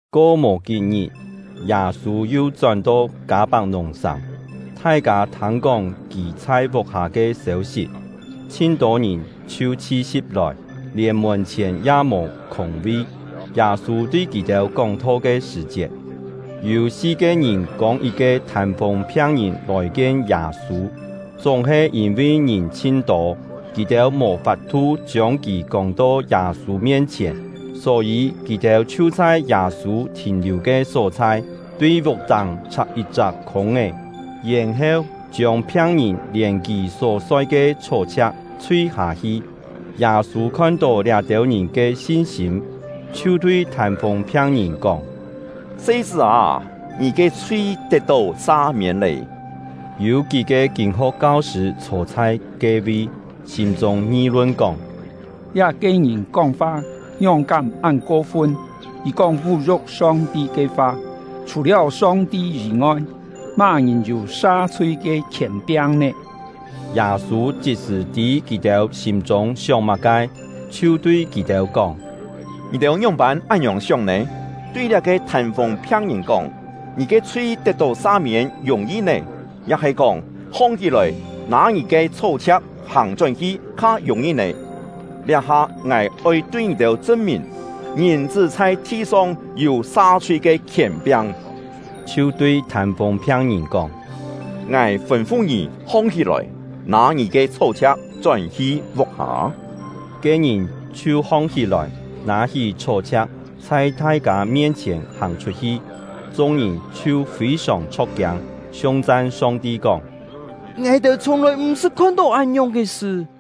Ko mò kí-ngit, Yâ-sû yu chón-to Kâ-pak-nùng-sàng; thai-kâ thâng-kóng kì chhai vuk-hâ ke sêu-sit. Chhin-tô ngìn chhiu chhi-si̍p lòi, lièn mùn-chhièn ya mò khûng-vi. Yâ-sû tui kì-têu kóng-tho ke sṳ̀-chiet, yû si-ke ngìn kông yit-ke thân-fûng phiang-ngìn lòi-kien Yâ-sû. Chúng-he yîn-vi ngìn chhin-tô, kì-têu mò fap-thu chiông kì kông-to Yâ-sû mien-chhièn. Só-yî kì-têu chhiu chhai Yâ-sû thìn-liù ke só-chhai, tui vuk-táng chhak yit-chak khûng-é; yèn-heu, chiông phiang-ngìn lièn kì só soi ke chhó-chhia̍k, chhui-hâ-hi. Yâ-sû khon-tó liá-têu ngìn ke sin-sîm, chhiu tui thân-fûng phiang-ngìn kóng: “Se-chṳ́ â, ngì ke chhui tet-tó sa-miên lé.” Yû kí-ke kîn-ho̍k kau-sṳ̂ chhô chhai ke-vi, sîm-chûng ngi-lun kóng: “Liá-ke ngìn kóng-fa ngióng-kám án ko-fun! Kì kóng vú-yu̍k Song-ti ke fa! Chhù-liáu Song-ti yî-ngoi, má-ngìn yû sa-chhui ke khièn-piang nè?” Yâ-sû chit-sṳ̀ tî kì-têu sîm-chûng sióng má-ke, chhiu tui kì-têu kóng: “Ngì-têu ngióng-pân án-ngiòng sióng nè? Tui liá-ke thân-fûng phiang-ngìn kóng: ‘Ngì ke chhui tet-tó sa-miên’ yùng-yi nè? Ya-he kóng: ‘Hong-hí-lòi, nâ ngì ke chhó-chhia̍k hàng-chón-hi’ kha yùng-yi nè? Liá-ha ngài oi tui ngì-têu chṳn-mìn, Ngìn-chṳ́ chhai thi-song yû sa-chhui ke khièn-piang.” Chhiu tui thân-fûng phiang-ngìn kóng: “Ngài fûn-fu ngì hong-hí-lòi, nâ ngì ke chhó-chhia̍k chón-hi vuk-hâ!” Ke-ngìn chhiu hong-hí-lòi, nâ-hí chhó-chhia̍k, chhai thai-kâ mien-chhièn hàng chhut-hi. Chung-ngìn chhiu fî-sòng chho̍k-kiâng, siung-chan Song-ti kóng: “Ngài-têu chhiùng-lòi màng-sṳt khon-tó án-ngiòng ke sṳ!”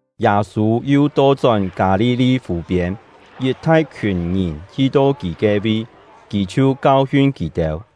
Yâ-sû yu to-chón Kâ-li-li fù-piên, yit thai-khiùn ngìn hi-to kì ke-vi, kì chhiu kau-hiun kì-têu.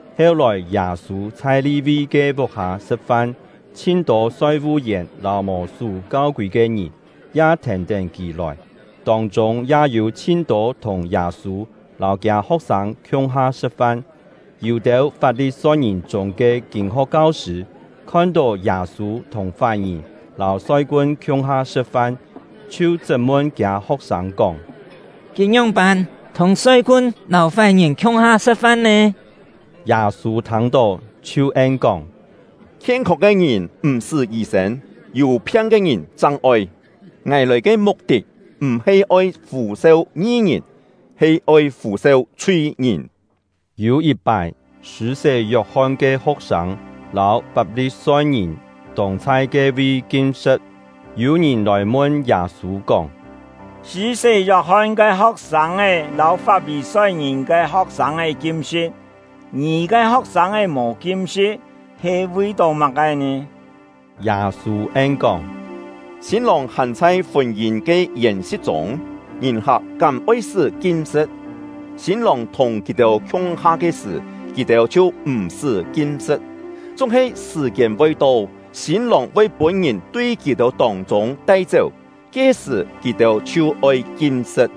Heu-lòi Yâ-sû chhai Li-vi ke vuk-hâ sṳ̍t-fan, chhin-tô soi-vu-yèn lâu mò sú kau-kûi ke ngìn ya thèn-tén kì lòi, tông-chûng ya yû chhin-tô thùng Yâ-sû lâu kiâ ho̍k-sâng khiung-ha sṳ̍t-fan. Yû-têu Fap-li-soi-ngìn chûng ke kîn-ho̍k kau-sṳ̂ khon-tó Yâ-sû thùng fái-ngìn lâu soi-kun khiung-ha sṳ̍t-fan, chhiu chṳt-mun kiâ ho̍k-sâng kóng: “Kì ngióng-pân thùng soi-kun lâu fái-ngìn khiung-ha sṳ̍t-fan nè?” Yâ-sû thâng-tó, chhiu en-kóng: “Khien-không ke ngìn m̀-sṳ́ yî-sên, yû phiang ke ngìn chang oi. Ngài lòi ke muk-tit m̀-he oi fû-seu ngi-ngìn, he oi fû-seu chhui-ngìn.” Yû yit-pái, Sṳ̂-sé Yok-hon ke ho̍k-sâng lâu Fap-li-soi-ngìn tông chhai ke-vi kim-sṳ̍t, yû ngìn lòi mun Yâ-sû kóng: “Sṳ̂-sé Yok-hon ke ho̍k-sâng lâu Fap-li-soi-ngìn ke ho̍k-sâng kim-sṳ̍t, ngì ke ho̍k-sâng mò kim-sṳ̍t, he vi-tó má-ke nè?” Yâ-sû en-kóng: “Sîn-lòng hàn chhai fûn-yîn ke yèn-si̍t chûng, ngìn-hak kám oi-sṳ́ kim-sṳ̍t? Sîn-lòng thùng kì-têu khiung-ha ke sṳ̀, kì-têu chhiu m̀-sṳ́ kim-sṳ̍t. Chúng-he sṳ̀-kiên voi to, sîn-lòng voi pûn-ngìn tui kì-têu tông-chûng tai-chéu, ke-sṳ̀ kì-têu chhiu oi kim-sṳ̍t.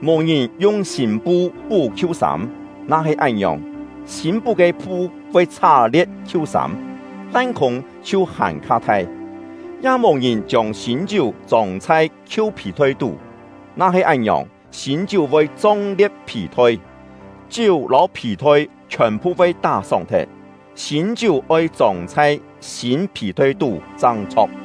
“Mò ngìn yung sîn-pu pú khiu-sâm; na-he án-ngiòng, sîn pú ke pu voi chhá-lie̍t khiu-sâm, lan-khûng chhiu hàn-kha thai. Ya mò ngìn chiông sîn-chiú chông chhai khiu phì-thoi tú; na-he án-ngiòng, sîn-chiú voi chong-lie̍t phì-thoi, chiú lâu phì-thoi chhiòn-phu voi tá-sóng thet. Sîn-chiú oi chông chhai sîn phì-thoi tú chang chho̍k!”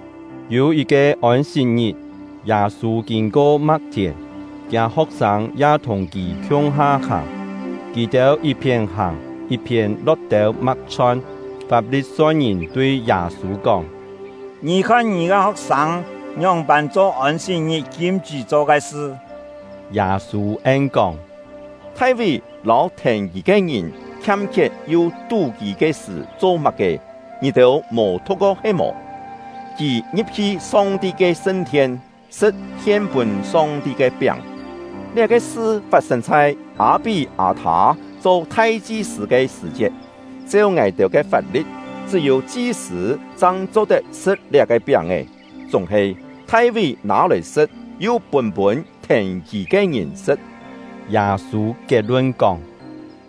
Yû yit-ke Ôn-sit-ngit, Yâ-sû kîn-ko ma̍k-thièn, kiâ ho̍k-sâng ya thùng kì khiung-ha hàng; kì-têu yit-phién hàng yit-phién lo̍t têu ma̍k-chhon. Fap-li-soi-ngìn tui Yâ-sû kóng: “Ngì khon, ngì ke ho̍k-sâng ngióng-pân cho Ôn-sit-ngit kim-chṳ́ cho ke sṳ?” Yâ-sû en-kóng: “Thai-ví lâu thèn kì ke ngìn khiam-khiet yu tú-kî ke sṳ̀ cho má-ke, ngì-têu mò thu̍k-ko he-mò? Kì ngi̍p-hi Song-ti ke sṳn-thien, sṳ̍t hien-pûn Song-ti ke piáng. Liá-ke sṳ fat-sên chhai Â-pí-â-thâ cho thai-chi-sṳ̂ ke sṳ̀-chiet. Cheu ngài-têu ke fap-li̍t, chṳ́-yû chi-sṳ̂ chang cho-tet sṳ̍t liá-ke piáng-è; chúng-he Thai-ví nâ-lòi sṳ̍t, yu pûn-pûn thèn kì ke ngìn sṳ̍t.” Yâ-sû kiet-lun kóng: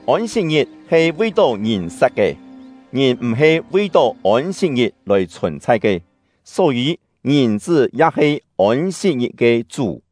“Ôn-sit-ngit he vi-tó ngìn sat ke; ngìn m̀-he vi-tó Ôn-sit-ngit lòi chhùn-chhai ke. Só-yî Ngìn-chṳ́ ya he Ôn-sit-ngit ke Chú.”